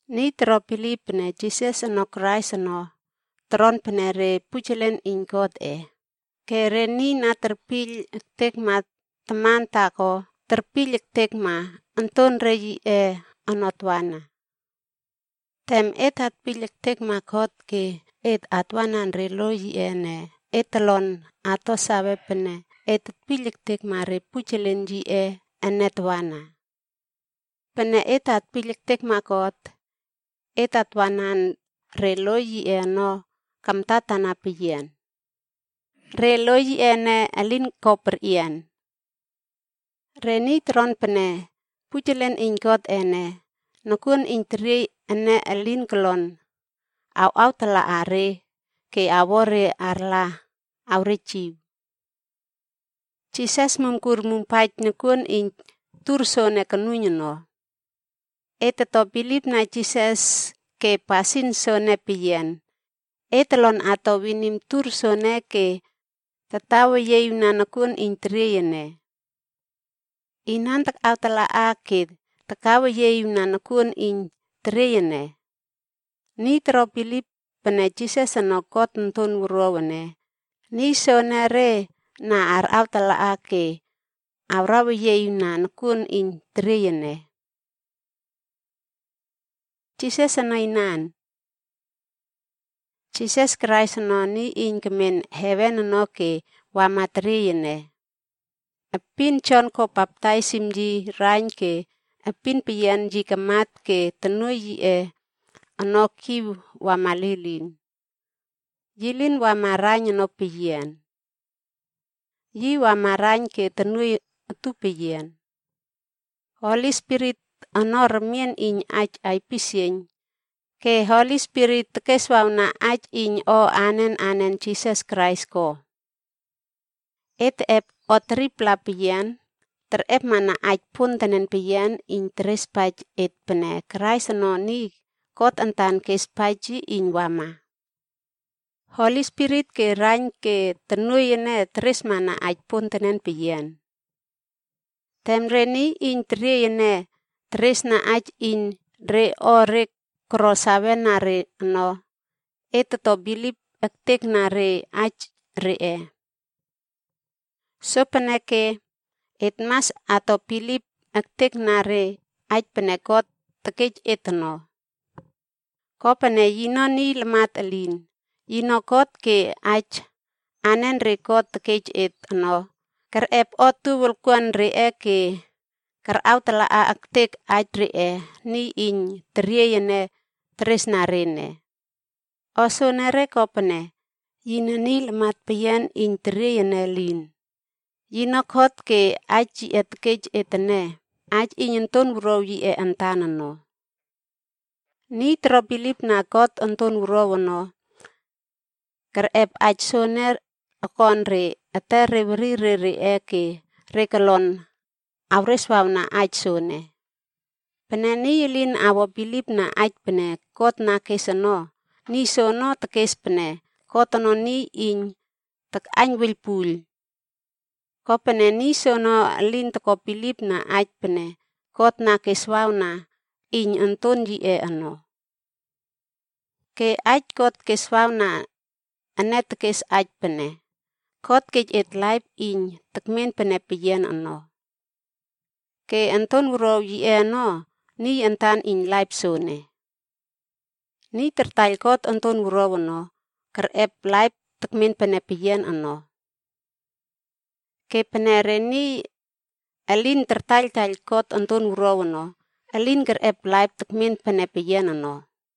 Niy toro bilip pene Jisas ono Krais ono, toron pene re pujelen iyn Godꞌe. Ke re niy na terpiyl ektekma taman taako, terpiyl ektekma ontonre yiꞌe ono tawana. Tem et atpiyl ektekma God ke et atwanan re lo yiꞌe ene, et tolon ato sawe pene et tetpiyl ektekma re pujelen yiꞌe ene tawana. Pene et atpiyl ektekma God, et atwanan re lo yiꞌe ono kamtatana peyian. Re lo yiꞌe ene, elin ko perꞌian. Re niy toron pene pujelen iyn Godꞌe ene, nokuon iyn teriey ene elin kolon awꞌawtalaꞌa re ke awo re arla awrejiw. Jisas mumkur mumpaij nokuon iyn tur soene konuiyn ono. Et toto bilipna Jisas ke pasin soene peyian, et tolon ato winim tur soene ke tataweyieꞌiwna nokuon iyn teriey ene. Inan takꞌawtala ke takaweyieꞌiwna nokuon iyn teriey ene? Niy toro bilip pene Jisas ono God Onton Wuruaw ene, niy soenere na arꞌawtala ke awraweyieꞌiwna nokuon iyn teriey ene. Jisas ono Inan? Jisas Krais ono, niy na kemen heven ono ke wama teriey ene. Epin Jon ko baptaisim yi raiyn ke epin peyian yi kamat ke tonuoiy yiꞌe ono kiw wama lilin. Yi lin wama raiyn ono peyian. Yi wama raiyn ke tonuoiy utupeyian. Holi Spirit ono remien iyn aij aipisieiyn, ke Holi Spirit tekeswawna aij iyn o anen anen Jisas Krais ko. Et teꞌep o 3-pla iyn terꞌepmana aij pontenen peyian iyn terespaij et pene Krais ono niy God antan kespaij yi iyn wama. Holi Spirit ke raiyn ke tonuoiy ene teresmana aij pontenen peyian. Tem re niy iyn teriey ene teresna aij iyn re o re koro sawena re ono, et toto bilip ektekna re aij reꞌe. Sopeneke, et mas ato bilip ektekna re aij pene God tekej et ono. Kopene yino niy lamat elin, yino God ke aij anenre God tekej et ono, kerꞌep otuow wolkuan reꞌe ke karꞌawtalaꞌa ektek aij reꞌe niy iyn teriey ene teresna re ene. O soene kopene, yine niy lamat peyian iyn teriey ene elin, yino God ke aij yi tekej et ene, aij iyn Onton Wuruaw yiꞌe antan ono. Niy toro bilipna God Onton Wuruaw ono, kerꞌep aij soene okon re etere werire reꞌe ke re kolon awreswawna aij soene. Pene niy elin awo bilipna aij pene God na kes ono, niy soono tekes pene God ono niy iyn takꞌaiyn wuiylpuiyl. Kopene niy soono elin toko bilipna aij pene God na keswawna iyn Onton yiꞌe ono. Ke aij God keswawna ene tekes aij pene: God kej et laip iyn tekmen pene peyian ono. Ke Onton Wuruaw yiꞌe ono, niy antan iyn laip soene. Niy tartaiyl God Onton Wuruaw ono, kerꞌep laip tekmen pene peyian ono. Ke pene re niy elin tartaiyltaiyl God Onton Wuruaw ono, elin kerꞌep laip tekmen pene peyian ono.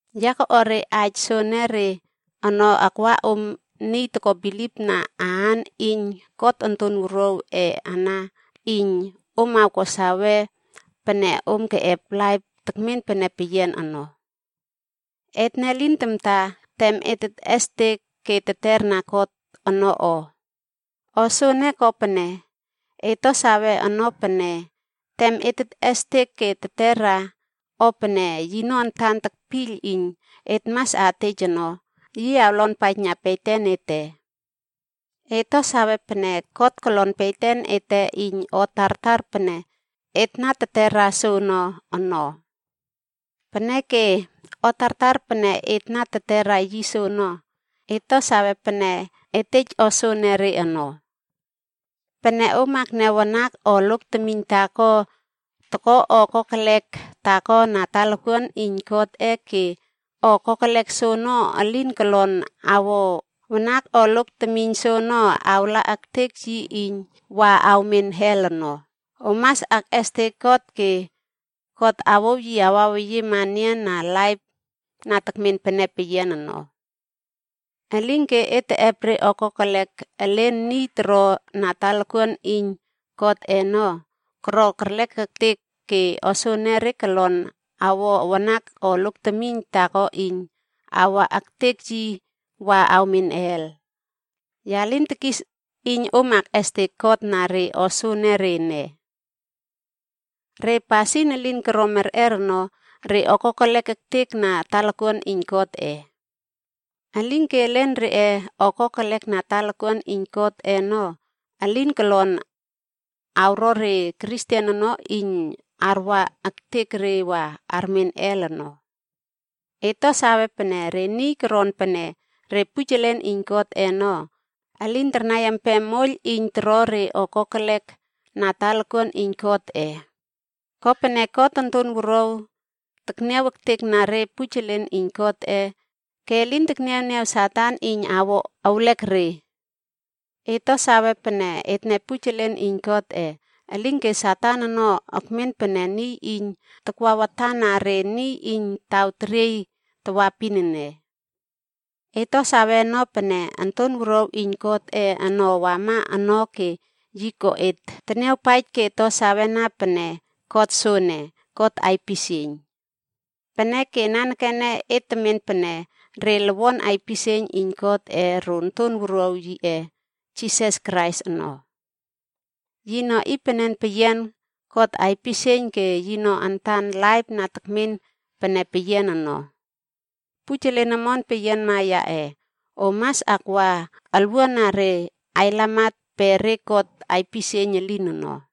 Ya koꞌuar re aij soenere ono akwana om niy toko bilipna aan iyn God Onton Wuruawꞌe ana, iyn om awko sawe pene om keꞌep laip tekmen pene peyian ono. Etne lin tamta tem et tetꞌestek ke teterna God ono o. O soene kopene, et to sawe ono pene tem et tetꞌestek ke tetera o pene yino antan tekpiyl iyn et mas atej ono, yi awlonpaijna beten ete. Et to sawe pene God kolon beten ete iyn o tartar pene et na tetera soono ono. Peneke, o tartar pene et na tetera yi soono, et to sawe pene et tej o soenere ono. Pene om akniaw wanak o lok temiyn taako toko o kokelek taako na talakuan iyn Godꞌe ke o kokelek soono elin kolon awo wanak o lok temiyn soono awa ektek yi iyn wa awmen hel ono, om mas akꞌestek God ke God awouw yi awaweyiema enian na laip na tekmen pene peyian ono. Elinke et teꞌep re o kokelek elen niy toro na talakuan iyn Godꞌe ono, koro kerlek ektek ke o soenere kolon awo wanak o lok temiyn taako iyn awa ektek yi wa awmen hel. Ya lin tekis iyn om akꞌestek God na re o soenere ene. Re pasin elin koro merꞌer ono, re o kokelek ektek na talakuan iyn Godꞌe. Elinke elen reꞌe o kokelek na talakuan iyn Godꞌe ono, elin kolon awro re Kristen ono iyn arwa ektek re wa armen hel ono. Et to sawe pene re niy koron pene re pujelen iyn Godꞌe ono, elin tarnai empem moiyl iyn toro re o kokelek na talakuan iyn Godꞌe. Kopene God Onton Wuruaw tekniaw ektekna re pujelen iyn Godꞌe ke elin tekniawniaw Satan iyn awo ewlek re. Et to save pene etne pujelen iyn Godꞌe, elinke Satan ono ekmen pene niy iyn takwa watana re niy iyn taw teriey tawaepin ene. Et to sawe ono pene Onton Wuruaw iyn Godꞌe ono wama ono ke yi ko et teniawpaij ke to sawena pene God soene, God aipisieiyn. Peneke nanekene et tetmen pene re lowon aipisieiyn iyn Godꞌe ro Onton Wuruaw yiꞌe Jisas Krais ono. Yino iynpenen peyian God aipisieiyn ke yino antan laip na tekmen pene peyian ono. Pujelen omon peyianma yaꞌe, om mas akwa olwuana re ailamat pe re god aipisieiyn elin ono.